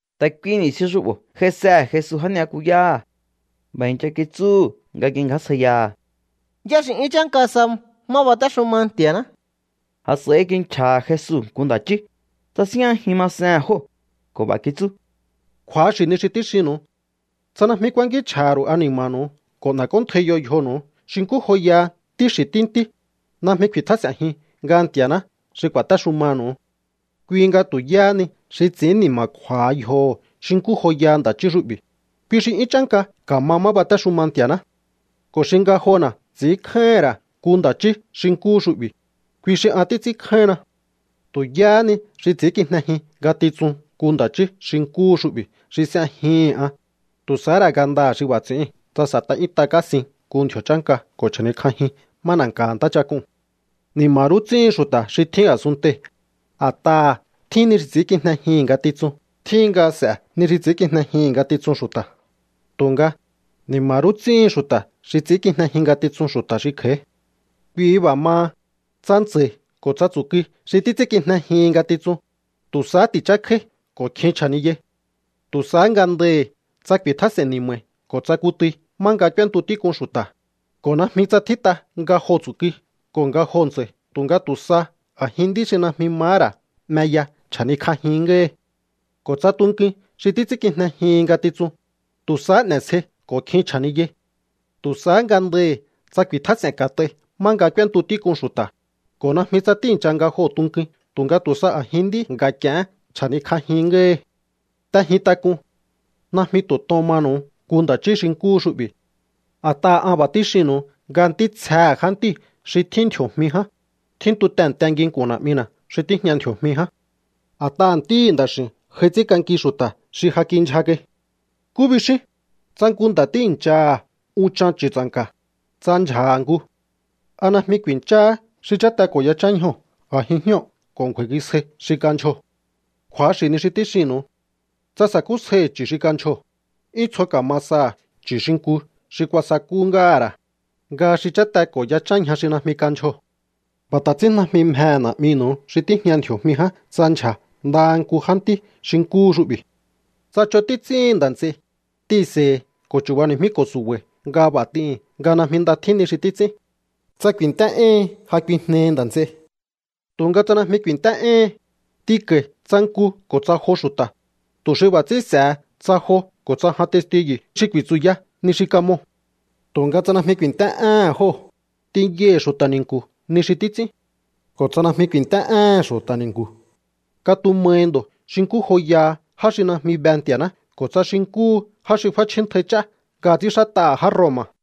Ta̱ kui ni̱stjin xu'bo̱ j'aisehe̱ Jesu já ni'yakuyáha̱. B'a̱ i̱ncha kitsúhu̱ nga kingjásjaiyaha̱: —¿Yá xi 'yún chánka sa má batéxuma Nti̱a̱ná? A̱s'a̱i kinchja̱ha̱ Jesu nku nda̱ chí, tsasíjñajin masehe̱n jóo̱ ko̱ b'a̱ kitsú: —Kju̱axi̱ ni xi tíxinnu̱u. Tsa najmi kuankínchj'a̱ha̱ ru̱u ani̱ma̱nu̱u ko̱ n'e̱k'óntjaiyo yjonu̱u xi nkú joyaha ntí xi̱ ntí ntí, najmi ku̱i̱tjás'e̱njiun nga Nti̱aṉá xi ku̱a̱téxumanu̱u. Kui nga tu̱ yáha ni xi ts'i̱ín ni̱ma̱kju̱a̱ha yjoho̱ xi nkú joyaha nda̱ chí xu'bi̱, kui xi 'yún chánka ka̱ma má batéxuma Nti̱a̱ná. Ko̱ xi ngajona̱ ts'i̱ínkjáíhi̱n ra̱ nku nda̱ chí xi nkúhu xu'bi̱, kui xi an títs'ínkjáínna. ’Tu̱ yáha ni xi ts'i̱ínkijnejin ngatitsun nku nda̱ chí xi nkúhu xu'bi̱ xi s'ejihi̱n an, tu̱ sahá ra̱ ngandaha̱ xi b'a̱ ts'i̱íu̱n tsa s'e̱t'a 'yúnt'a kásin nku ndji̱o̱ chánka ko̱ chja̱nikj'ajin má na̱nka̱ha̱ ntáchak'uu̱n. ¡Ni̱ma̱ rú ts'íhin xu̱ta̱ xi tjín a̱sunntei̱, a̱t'aha̱ tjín ni xi ts'ínkijnejihi̱n ngatitsun! Tjíhin nga s'e̱ ni xi ts'i̱ínkijnejihi̱n ngatitsun xu̱ta̱, tu̱nga, ¡ni̱ma̱ rú ts'íhin xu̱ta̱ xi ts'i̱ínkijnejin ngatitsun xu̱ta̱ xi kj'a̱í! ’Kui b'a̱ maha, tsa ntsa̱i̱ ko̱ tsa tsu̱kui xi títs'ínkijnejihin ngatitsun, tu̱ sahá ti̱chákjáí ko̱ kjin chja̱niyai. Tu̱ sahá ngandahi̱ tsa ku̱i̱tjás'e̱n ni̱ma̱i̱ ko̱ tsa kutui má nga k'úéntu tík'un xu̱ta̱, ko̱ najmi tsa tjít'a nga joo̱ tsu̱kui ko̱ nga joo̱ ntsa̱i̱ tu̱nga tu̱ sa a̱jin nd'í xi najmi mahá ra̱ 'meya chja̱nikj'ajin ngáhi. Ko̱ tsa tunkuin xi títs'ínkijnejihin ngatitsun, tu̱ sahá n'e̱sjei ko̱ kjin chja̱niyai. Tu̱ sahá ngandahi̱ tsa ku̱i̱tjás'e̱n ka̱t'ai má nga k'úéntu tík'un xu̱ta̱, ko̱ najmi tsa tíi̱ncha nga joo̱ tunkuin tu̱nga tu̱ sa a̱jin nd'í nga̱k'i̱e̱hén chja̱nikj'ajin ngáhi. ’T'ejin tak'un. Najmi tu̱ tohón manu̱u nku nda̱ chí xi nkúhu xu'bi̱. A̱t'aha̱ an b'a̱ tíxinnu̱u nga ntítsjehe̱ jántíu̱ xi tjín ndji̱o̱jmi ján, tjíntu tehe̱nte nginku̱n Na̱'mina̱ xi tíjña ndji̱o̱jmi ján. A̱t'aha̱ Ntíhi̱ Nda̱x'i̱u̱n j'ai ts'ínk'anki xu̱ta̱ xi ja kindyja kai. ’¿Nkú bixíún? Tsa nku nda̱ tíi̱nchaha̱ unchan chu̱tsa̱nka̱, tsa ndyja̱ha̱ nku, ¿a najmi ku̱i̱ncháhá xi cháte ko̱ yachán ñjoo̱ a̱jin jñóo̱ ko̱ ngju̱a̱i̱ngisjáí xi kandyjoo̱? Kju̱axi̱ ni xi tíxinnu̱u. Tsa sa̱kúsjaihi̱ chu̱ xi kandyjoo̱, 'yún tsjo ka̱ma saha̱ chu̱ xi nku xi kuasakú ngáha̱ ra̱, nga xi cháte ko̱ yachán ñja xi najmi kandyjoo̱. B'a̱ ta̱ ts'ín najmi mjehe̱ Na̱'minu̱u xi tíjña ndji̱o̱jmi ján tsa ndyja̱ ndaha nku jántí ntí xi nkúhu xu'bi̱. ’Tsa ch'on títs'íhin nda̱ nts'ei, t'ihi̱nse̱i̱hi̱ ko̱ chu̱bani̱jmíko̱ su̱ba̱i̱ nga b'a̱ t'ihi̱n nga najmi nda tjín ni xi títs'ín. Tsa ku̱i̱nt'é éhin, ja kuijnehi nda̱ nts'ei. Tu̱nga tsa najmi ku̱i̱nt'é éhin, t'inko̱i̱ tsa nku ko̱ tsa jo xu̱ta̱, tu̱ xi b'a̱ ts'ín s'e̱he tsa jo ko̱ tsa jan testiyu̱ xi ku̱i̱tsu̱ya ni xi kamoo̱. Tu̱nga tsa najmi ku̱i̱nt'é éhe̱n jóo̱, t'inyaihi̱ xu̱ta̱ ni̱nku̱ ni xi títs'ín. Ko̱ tsa najmi ku̱i̱nt'é éhe̱n xu̱ta̱ ni̱nku̱, katumahi ndo̱ xi nkú joyaha já xi najmi be Nti̱a̱ná ko̱ tsa xi nkúhu já xi f'áchjíntai ch'á nga ts'ínxát'aha̱ já Roma.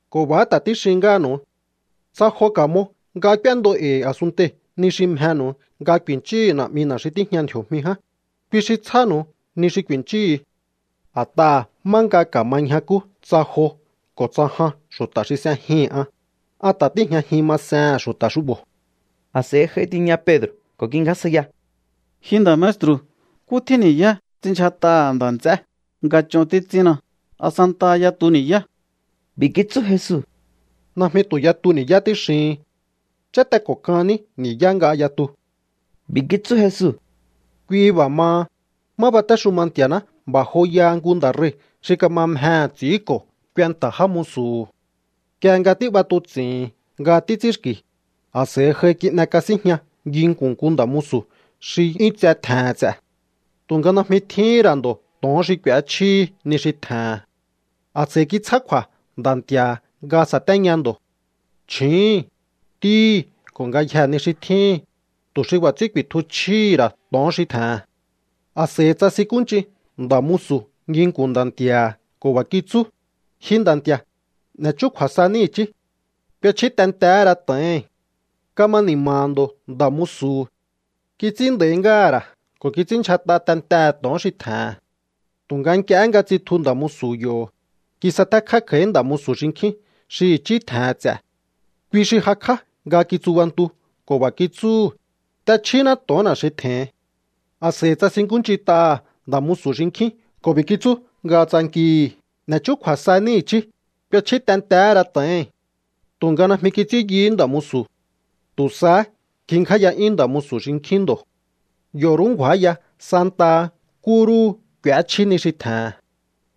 Ko̱ b'a̱há ta̱ tíxin ngáhanu̱u. Tsa jo ka̱mo nga k'úéndo e̱i̱ a̱sunntei̱ ni xi mjenu̱u nga ku̱i̱nchíhu̱u Na̱'mina̱ xi tíjña ndji̱o̱jmi ján, kui xi tsjánu̱u ni xi ku̱i̱nchíú. A̱t'aha̱ má nga ka̱ma ñjakú tsa jo ko̱ tsa jan xu̱ta̱ xi s'ejihi̱n an, an ta̱ tíi̱jñajin masehe̱n xu̱ta̱ xu'bo̱. A̱s'a̱i j'ai tiña Pedro̱ ko̱ kingjásjaiya: —Ji nda̱ maestru̱, ¿nkú tjín ni̱yá ts'inndyjat'aha̱ nda̱ nts'é nga ch'on títs'ínna? ¿A santaha yatu ni̱yá? B'i̱ kitsú Jesu: —Najmi tu̱ yatu ni̱yá tíxihin. Cháte ko̱ kan ní ni̱yá nga yatu. B'i̱ kitsú Jesu: —Kui b'a̱ maha, má batéxuma Nti̱a̱ná b'a̱ joyaha nku nda̱ rei̱ xi kama mjehe̱ ts'i̱ínko̱ kuenta̱ já musu̱hu̱. Nk'ie nga tíb'atuts'i̱hi̱n nga títs'ínxki̱, a̱s'a̱i j'ai kin'ekasínjña nginku̱n nku nda̱ musu̱ xi 'yún tse tje̱he̱n ts'e̱. Tu̱nga najmi tjíhín ra̱ ndo̱ to̱on xi k'u̱échjíhi ni xi tje̱he̱n. A̱s'a̱i kitsjá kju̱a̱ nda̱ nti̱a̱ha̱ nga sa̱téña ndo̱, chju̱úhu̱n, ntíhi̱ ko̱ ngayjee̱ ni xi tjíhi̱n, tu̱ xi b'a̱ ts'ín ku̱i̱tju chjíhi̱ ra̱ to̱on xi tje̱he̱n. A̱s'a̱i tsasinkúnch'in nda̱ musu̱ nginku̱n nda̱ nti̱a̱ha̱ ko̱ b'a̱ kitsú: “Ji nda̱ nti̱a̱, n'e̱ chúkju̱a̱ saní i̱chí. K'uechjí tentehé ra to̱ohi̱n.” Kama ni̱ma̱ha̱ ndo̱ nda̱ musu̱hu̱. Kits'ín nda̱í ngáha̱ ra̱ ko̱ kits'ínndyjat'a tentehe̱ to̱on xi tje̱he̱n. ’Tu̱nga nk'iehé nga tsitju nda̱ musu̱ yo̱, kisatékjá kj'a̱í nda̱ musu̱ xinkjín xi i̱chí tje̱he̱n ts'e̱. Kui xi jakj'á nga kitsubantu ko̱ b'a̱ kitsúhu̱: “¡T'echjíná to̱onna̱ xi tje̱hin!” A̱s'a̱i tsasinkúnch'int'aha̱ nda̱ musu̱ xinkjín ko̱ b'i̱ kitsú nga tsankihi̱: “N'e̱ chúkju̱a̱ saní i̱chí. K'uechjí tentehé ra to̱ohi̱n.” Tu̱nga najmi kits'ín yuhú nda̱ musu̱. Tu̱ sahá ngjingjáya'yún nda̱ musu̱ xinkjín ndo̱. Yo̱ rú ngju̱áya santaha nkú rúhu k'u̱échjí ni xi tje̱he̱n.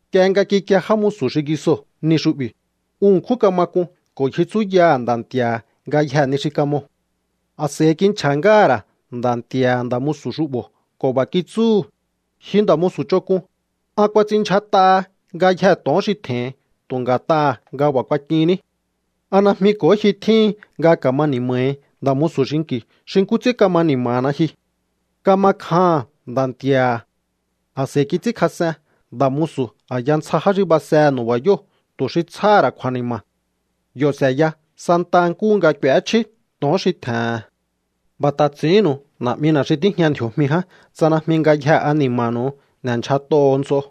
’Nk'ie nga kikie já musu̱ xingisoo̱ ni xu'bi̱, un ṉkjún kama k'un ko̱ ngji tsúyaha̱ nda̱ nti̱a̱ha̱ ngayjee̱ ni xi kamoo̱. A̱s'a̱i kinchja̱ ngáha̱ ra̱ nda̱nti̱a̱ha̱ nda̱ musu̱ xu'bo̱ ko̱ b'a̱ kitsúhu̱: “¡Ji nda̱ musu̱ ch'onk'un! An kuats'inndyjat'aha ngayjee̱ to̱on xi tje̱hin tu̱ nga̱t'aha̱ nga b'a̱ kuak'inní. ¿A najmi ko̱hó ji tjíhin nga ka̱ma ni̱ma̱hi nda̱ musu̱ xinki̱ xi nkú ts'ín kama ni̱ma̱na ji?” Kama kjaha̱n nda̱ nti̱a̱ha̱. A̱s'a̱i kits'ínkjas'en nda̱ musu̱ a̱ya ntsja já xi basehe̱ nu̱ba̱yóo̱ tu̱ xi tsjáha̱ ra̱ kju̱a̱ni̱ma̱. Yo̱ s'e̱ya santaha nkúhu nga k'u̱échjí to̱on xi tje̱he̱n. ’B'a̱ ta̱ ts'i̱ínnu̱u Na̱'mina̱ xi tíjña ndji̱o̱jmi ján tsa najmi ngayjehe ani̱ma̱nu̱u n'e̱ndyjat'oho̱o nts'o.